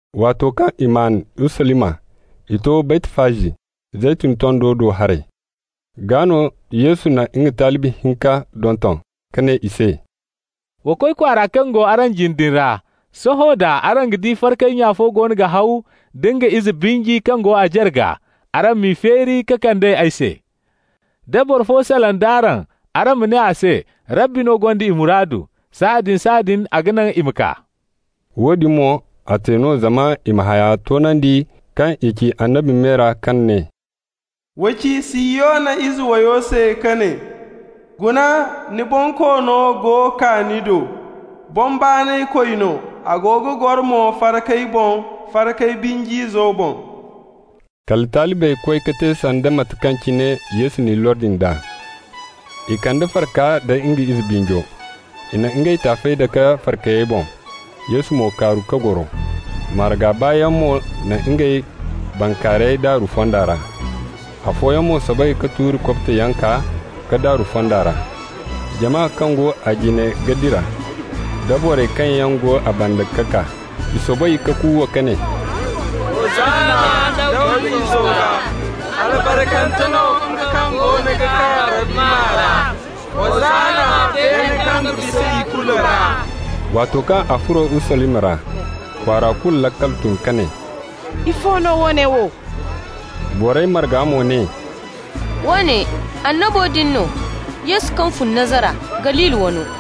Waato kaŋ i maan Urusalima, i to Baytfaji, Zeytun tondo do haray. Gaa no Yesu na nga talibi hinka donton ka ne i se: «Wa koy kwaara kaŋ go araŋ jine din ra. Sohõ da araŋ ga di farkay nya fo goono ga haw da nga ize binji kaŋ go a jarga. Araŋ m'i feeri ka kand'ey ay se. Da boro fo salaŋ d'araŋ, araŋ ma ne a se: ‹Rabbi no gonda i muraadu.› Sahãadin-sahãadin a ga naŋ i ma kaa.» Woodin mo, a te no zama i ma haya toonandi kaŋ i ci annabi me ra kaŋ ne: «Wa ci Sihiyona ize wayo se ka ne: ‹Guna, ni Bonkoono go kaa ni do. Boŋ baanaykoy no, a go ga goro mo farkay boŋ, farkay binj'izo boŋ.›» Kala talibey koy ka te sanda mate kaŋ cine Yesu n'i lordi nd'a. I kande farka nda nga ize binjo. I na ngey taafey dake farkayey boŋ, Yesu mo kaaru ka goro. Marga baayaŋ mo na ngey bankaarayey daaru fonda ra. Afooyaŋ mo soobay ka tuuri kobtoyaŋ kaa ka daaru fonda ra. Jama kaŋ go a jine ga dira, da borey kaŋ yaŋ go a banda ga kaa, i soobay ka kuuwa ka ne: «Hosanna Dawda Izo gaa!» «Albarkante no nga kaŋ goono ga kaa Rabbi maa ra!» «Hosanna beene kaŋ bisa ikulu ra!» Waato kaŋ a furo Urusalima ra, kwaara kulu laakal tun ka ne: «Ifo no woone wo?» Borey marga mo ne: «Woone annabo din no, Yesu kaŋ fun Nazara, Galili wano.»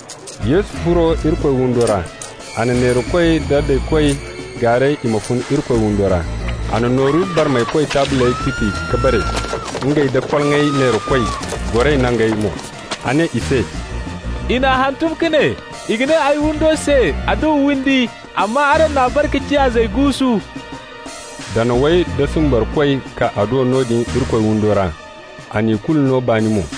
Yesu furo Irikoy windo ra. A na neerakoy da daykoy gaaray i ma fun Irikoy windo ra. A na nooru barmaykoy taabley tuti ka bare, ngey da koloŋay neerakoy goray nangey mo. A ne i se: «I n'a hantum ka ne: ‹I ga ne ay windo se adduwa windi.› Amma araŋ n'a bare ka ciya ‹zayyaŋ guusu›.» Danawey da simbarkoy kaa a do noodin Irikoy windo ra. A na ikulu no baani mo.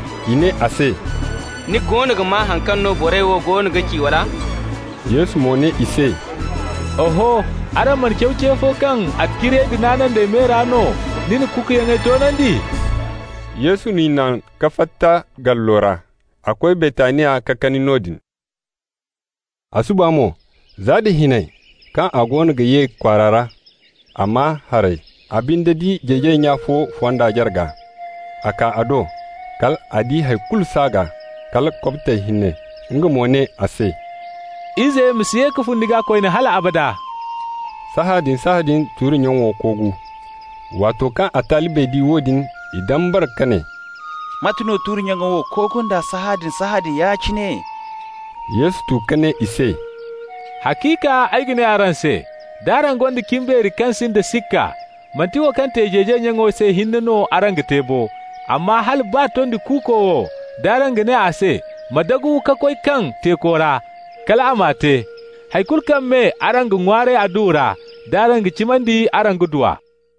I ne a se: «Ni goono ga maa haŋ kaŋ no borey wo goono ga ci, wala?» Yesu mo ne i se: «Oho. Araŋ mana caw ce fo kaŋ ‹Attaciriyey da naanandey me ra no ni na kukuyaŋey toonandi?›» Yesu n'i naŋ ka fatta gallo ra. A koy Baytaniya ka kani noodin. A suba mo, za da hinay, kaŋ a goono ga ye kwaara ra, a maa haray. A binde di jeejay nya fo fonda jarga. A kaa a do. Kal a di hay kulu s'a gaa, kala kobtey hinne. Nga mo ne a se: «Ize ma si ye ka fun ni gaa koyne hal abada.» Sahãadin-sahãadin tuuri-nyaŋo koogu. Waato kaŋ a talibey di woodin, i dambara ka ne: «Mate no tuuri-nyaŋo wo koogu nd'a sahãadin-sahãadin ya-cine?» Yesu tu ka ne i se: «Haciika ay ga ne araŋ se: d'araŋ gonda cimbeeri kaŋ sinda sikka, manti wo kaŋ te jeejay nyaŋo se hinne no araŋ ga te bo, amma hala baa tondi kuuko wo, d'araŋ ga ne a se: ‹Ma dagu ka koy kaŋ teeko ra,› kal a m'a te. Hay kulu kaŋ me araŋ ga ŋwaaray adduwa ra, d'araŋ ga cimandi, araŋ ga du a.»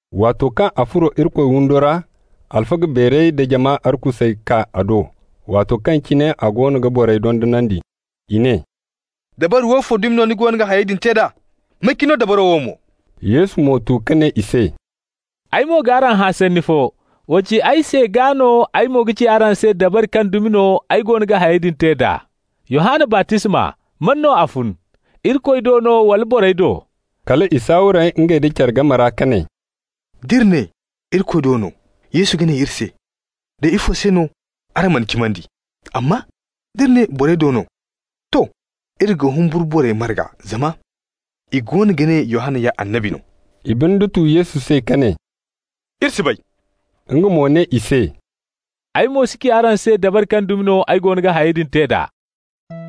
Waato kaŋ a furo Irikoy windo ra, alfaga beerey da jama arkusey kaa a do waato kaŋ cine a goono ga borey dondonandi. I ne: «Dabari woofo dumi no ni go ga hayey din te d'a? May ka ni no dabaro wo mo?» Yesu mo tu ka ne i se: «Ay mo g'araŋ hã sanni fo. Wa ci ay se, gaa no ay mo ga ci araŋ se dabari kaŋ dumi no ay goono ga hayey din te d'a. Yohanna baptisma, man no a fun? Irikoy do no, wala borey do?» Kala i saaware ngey nda care game ra ka ne: «D'iri ne: ‹Irikoy do no›, Yesu ga ne iri se: ‹Day, ifo se no araŋ man'a cimandi?› Amma d'iri ne: ‹Borey do no› -- to, iri ga humburu borey marga, zama i goono ga ne Yohanna ya annabi no.» I binde tu Yesu se ka ne: «Iri si bay.» Nga mo ne i se: «Ay mo si ci araŋ se dabari kaŋ dumi no ay goono ga hayey din te d'a.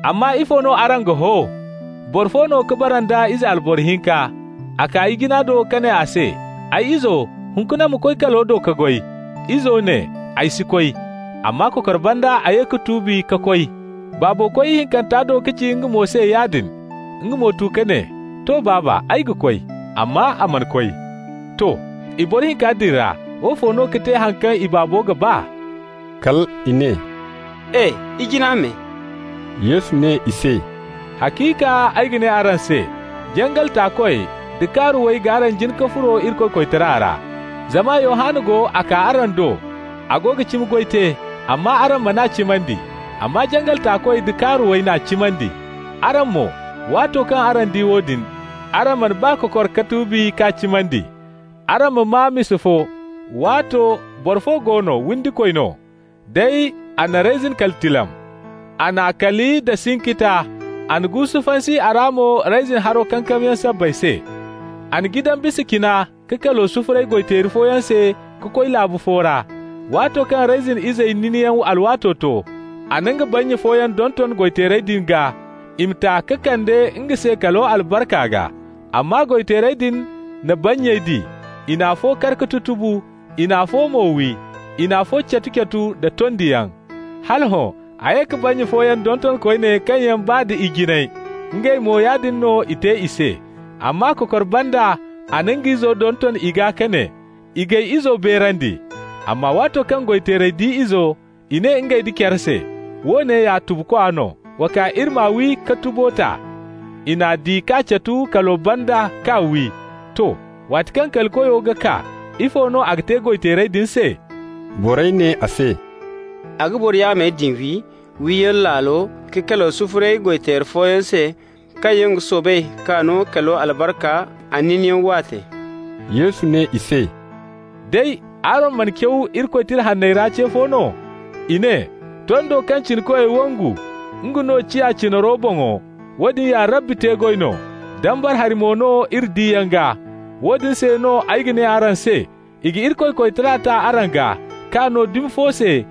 Amma ifo no araŋ ga ho? Boro fo no ka bara nda ize alboro hinka. A kaa ijina do ka ne a se: ‹Ay izo, hunkuna ma koy kalo do ka goy.› Izo ne: ‹Ay si koy.› Amma kokor banda a ye ka tuubi ka koy. Baabo koy ihinkanta do ka ci nga mo se yaadin. Nga mo tu ka ne: ‹To, baaba, ay ga.› Amma a mana koy. To. I boro hinka din ra woofo no ka te haŋ kaŋ i baabo ga ba?» Kal i ne: «E! ijina me!» Yesu ne i se: «Haciika ay ga ne araŋ se: jangal taakoy da kaaruwey g'araŋ jin ka furo Irikoy koytara ra. Zama Yohanna go, a kaa araŋ do, a go ga cimi goy te, amma araŋ man'a cimandi. Amma jangal taakoy da kaaruwey n'a cimandi. Araŋ mo, waato kaŋ araŋ di woodin, araŋ mana baa kokor ka tuubi k'a cimandi. Araŋ ma maa misa fo: Waato no boro fo go no, windikoy no. Day a na reyzin kali tilam. A n'a kali nda sinkita, a na guusu fansi a ra mo reyzin haro kankamyaŋ sabbay se. A na jidan bisa cina ka kalo sufuray goy-teeri fooyaŋ se ka koy laabu fo ra. Waato kaŋ reyzin izey ninyaŋ alwaato to, a na nga bannya fooyaŋ donton goy-teerey din gaa, i ma ta ka kande nga se kalo albarka gaa. Amma goy-teerey din na bannyey di. I na afo kar ka tutubu, i na afo mo wi, i na afo catu-catu nda tondiyaŋ. Hala hõ a ye ka bannya fooyaŋ donton koyne kaŋ yaŋ baa da ijiney. Ngey mo, yaadin no i te i se. Amma kokor banda a na nga izo donton i gaa ka ne: ‹I g'ay izo beerandi.› Amma waato kaŋ goy-teerey di izo, i ne ngey nda care se: ‹Woone ya tubukwa no. Wa kaa iri m'a wi ka tubo ta.› I n'a di k'a catu kalo banda k'a wi. To. Waati kaŋ kali koyo ga kaa, ifo no a ga te goy-teerey din se?» Borey ne a se: «A ga boro yaamey din wi, wiyaŋ laalo, ka kalo sufuray goy-teeri fooyaŋ se, kaŋ yaŋ ga soobay k'a no kalo albarka a ninyaŋ waate.» Yesu ne i se: «Day, araŋ mana caw Irikoy Tira Hanney ra ce fo no? I ne: ‹Tondo kaŋ cinakoy wangu, nga no ciya cinaro boŋo. Woodin ya Rabbi te-goy no, dambara hari mo no iri diyaŋ gaa.› Woodin se no ay ga ne araŋ se: i ga Irikoy koytara ta araŋ gaa, k'a no dumi fo se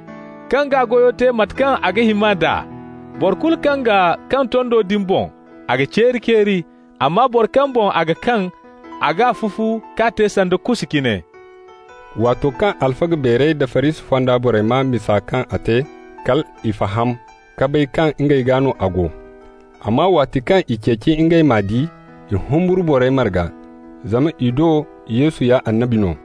kaŋ g'a goyo te mate kaŋ a ga hima nd'a. Boro kulu kaŋ ga kaŋ tondo din boŋ, a ga ceeri-ceeri, amma boro kaŋ boŋ a ga kaŋ, a g'a fufu k'a te sanda kusa cine.» Waato kaŋ alfaga beerey da Farisi fonda borey maa misa kaŋ a te, kal i faham ka bay kaŋ ngey gaa no a go. Amma waati kaŋ i ceeci ngey m'a di, i humburu borey marga, zama i do Yesu ya annabi no.